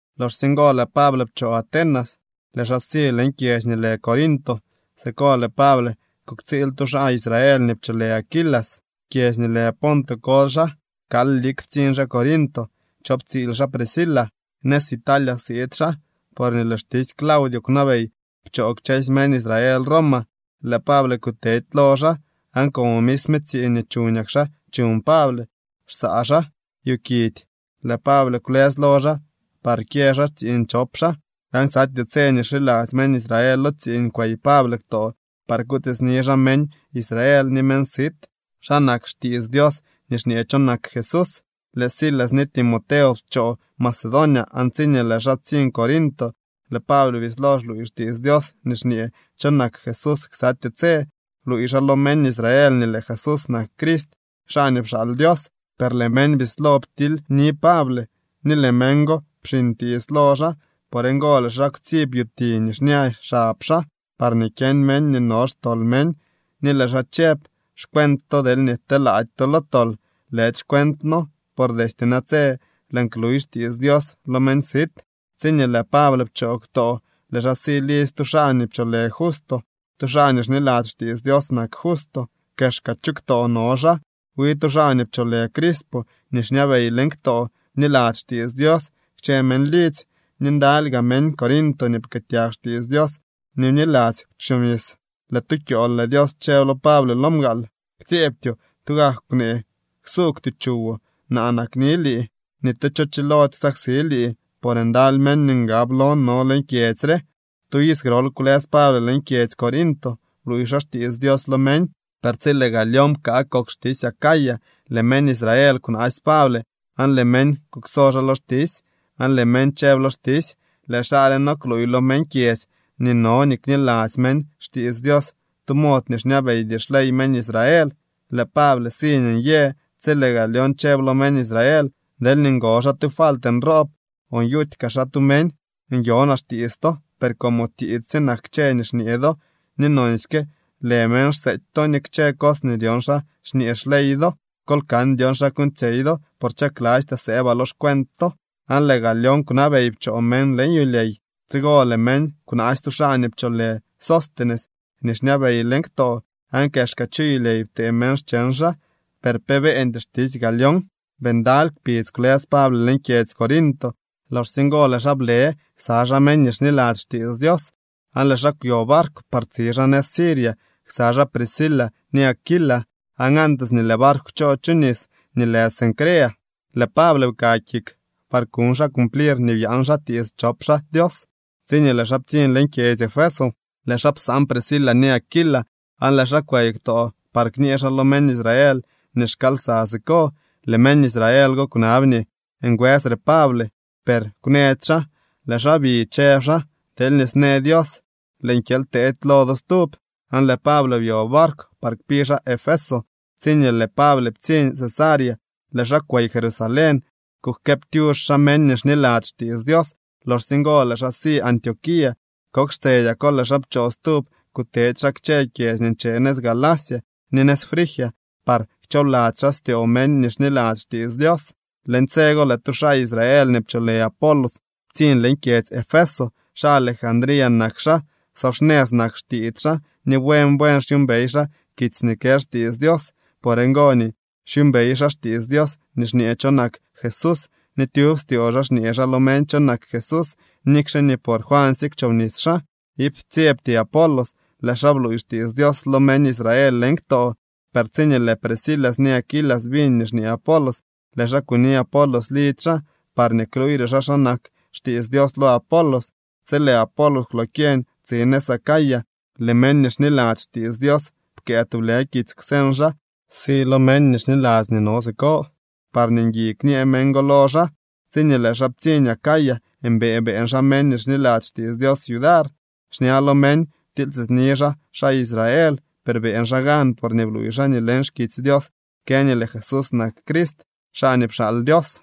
Loxsye ngo lëë Pable pchoo Atenas, lëë xaa si leñ kyedzy nii lë Corinto. Siko lëë Pable kuktsiil tu xaa Israel nii pcholë Aquila. Kyedzy nii lë Ponto koly xaa. Kal lik ptsiñ xaa Corinto chop tsiil xaa Priscila. Nëz Italia siid xaa, porñee lëë xtisy Claudio kwnabey pchoo kchësy meñ Israel Roma. Lëë Pable kutedy lo xaa aan, como misme tsiiñ nii chuñak xaa chuñ Pable, xsaa xaa yu kidy, lëë Pable kwlës lo xaa par kyë xaa tsiiñ chop xaa. Aan ksatyee tse nii xiladzy meñ Israel lo tsiiñ kwey Pable ktoo par kutiitsni xaa meñ Israel ni meñ sit xa nak xtiits Dios nii xñee cho nak Jesús. Lëë Silas ni Timoteo pchoo Macedonia aan tsiñee lëë xaa ptsiñ Corinto, lëë Pable bislo xluuy xtiits Dios nii xñee cho nak Jesús ksatyee tse. Bluuy xaa lo meñ Israel nii lëë Jesús nak Crist, xaa nii pxaal Dios. Per lëë meñ bislo ptilyni Pable ni lëë meñ go pxiñ tiits lo xaa. Por ngo lëë xaa kwtsib yuti nii xña xab xaa parñee kyeñ meñ nii no xtol meñ, ni lëë xaa chëb: —Xcuent to deelñee telaady to lo tol, lëdy xcuentno. Por destye natse lëën kluy xtiits Dios lo meñ sit. Tsiñee lëë Pable pchoo ktoo, lëë xaa si lidzy tu xaa nii pcholë Justo. Tu xaa nii xniladzy xtiits Dios nak Justo. Kexka chu ktoo no xaa. Wi tu xaa nii pcholë Crispo nii xñabey leñ ktoo bniladzy xtiits Dios kchë meñ lidzy. Ni ndaly gaa meñ Corinto nii pkëëtyag xtiits Dios ni bniladzy kwchobnis. Lëë tu kyool lëë Dios chëb lo Pable lo mgaal: —Ktsyeebtyoo. Tugak kwnee, ksuugwtyoo chuwoo. Naa nakni lii. Ni tu cho chilody ksaksi lii, por ndaly meñ nii ngab lon no leñ kyedzy re. Tu iz grol kwlës Pable leñ kyedzy Corinto, bluuy xaa xtiits Dios lo meñ. Per tsi lëë Galión pkaa kok xtisy Acaya, lëë meñ Israel kwnaasy Pable aan lëë meñ kukso xaa lo xtisy, aan lëë meñ chëb lo xtisy: —Lëë xaa re no kluuy lo meñ kyedzy nii no nii kniladzy meñ xtiits Dios tu mod nii xñabeydy xley meñ Israel. Lëë Pable si nii nyee, tsi lëë Galión chëb lo meñ Israel: —Deelñee ngo xaa tu falt nroob o nyuty kaa xaa tu meñ, nyonaa xtiits to. Per como tiits sye nak kchë nii xñee do ni nonsyke lë meñ xseety to ni kchë cos nii dyon xa xñee xley do, kol kan dyon xa kuuñtsyey do, por chaklastyaa sëëbaa lo xcuent to. Aan lëë Galión kwnabey pchoo meñ leñ yulyey. Tsigo lëë meñ kwnaasy tu xaa nii pcholë Sóstenes nii xñabey leñ ktoo, aan kexka chu yulyey ptee meñ xcheñ xaa, per pe beeñdy xtisy Galión. Bii ndaly kpidz kwlës Pable leñ kyedzy Corinto. Loxsye ngo lëë xaa blë ksa xaa meñ nii xniladzy xtiits Dios, aan lëë xaa kwyo barkw par tsi xaa nëz Siria ksa xaa Priscila ni Aquila. Aan antes nii lëë barkw kchoo chu nis nii lë Cencrea, lëë Pable pka kik par kuñ xaa cumplir nii byaan xaa tiits chop xaa Dios. Tsiñee lëë xaa ptsiñ leñ kyedzy Efeso, lëë xaa psaan Priscila ni Aquila, aan lëë xaa kwey ktoo par kñee xaa lo meñ Israel nii xkaal lsa siko. Lëë meñ Israel go kwnab nii ngwësre Pable, per kwnëdy xaa. Lëë xaa bi, chëb xaa: —Deelñee snë Dios, lëën kyely teedy lo do stub. Aan lëë Pable byo barkw par kpi xaa Efeso. Tsiñee lëë Pable ptsiñ Cesarea, lëë xaa kwey Jerusalén kujkëëptyux xaa meñ nii xniladzy xtiits Dios. Loxsye ngo lëë xaa si Antioquía. Kok xtsedyako lëë xaa pchoo stub, kutedy xaa kchë kyedzy nii nche nëz Galacia ni nëz Frigia par kchoobladzy xaa styoo meñ nii xniladzy xtiits Dios. Leñ tse go lëë tu xaa Israel nii pcholë Apolos ptsiñ leñ kyedzy Efeso. Xaa Alejandría nak xaa. So xnëz nak xtiits xaa ni buen buen xyuumbey xaa kitsy nii kë xtiits Dios. Por ngo nii xyuumbey xaa xtiits Dios nii xñee cho nak Jesús ni tyub styoo xaa xñee xaa lo meñ cho nak Jesús, nikxe nii por Juansye kwchobnis xaa. Iip ptsyebty Apolos, lëë xaa bluuy xtiits Dios lo meñ Israel leñ ktoo. Per tsiñee lëë Priscila ni Aquila biñ nii xñee Apolos, lëë xaa kuni Apolos lidzy xaa parñee kluuyre xaa xa nak xtiits Dios lo Apolos. Tsi lëë Apolos kwlokyeñ tsi nëz Acaya, lëë meñ nii xniladzy xtiits Dios pkëë tublë kitsy kwseñ xaa si lo meñ nii xniladzy nii no siko, parñee ngui kñee meñ go lo xaa. Tsiñee lëë xaa ptsiñ Acaya, mbëë beeñ xaa meñ nii xniladzy xtiits Dios yudar. Xña lo meñ ptilytiitsni xaa xaa Israel, per beeñ xaa gan porñee bluuy xaa nii leñ xkitsy Dios kë nii lëë Jesús nak Crist, xaa nii pxaal Dios.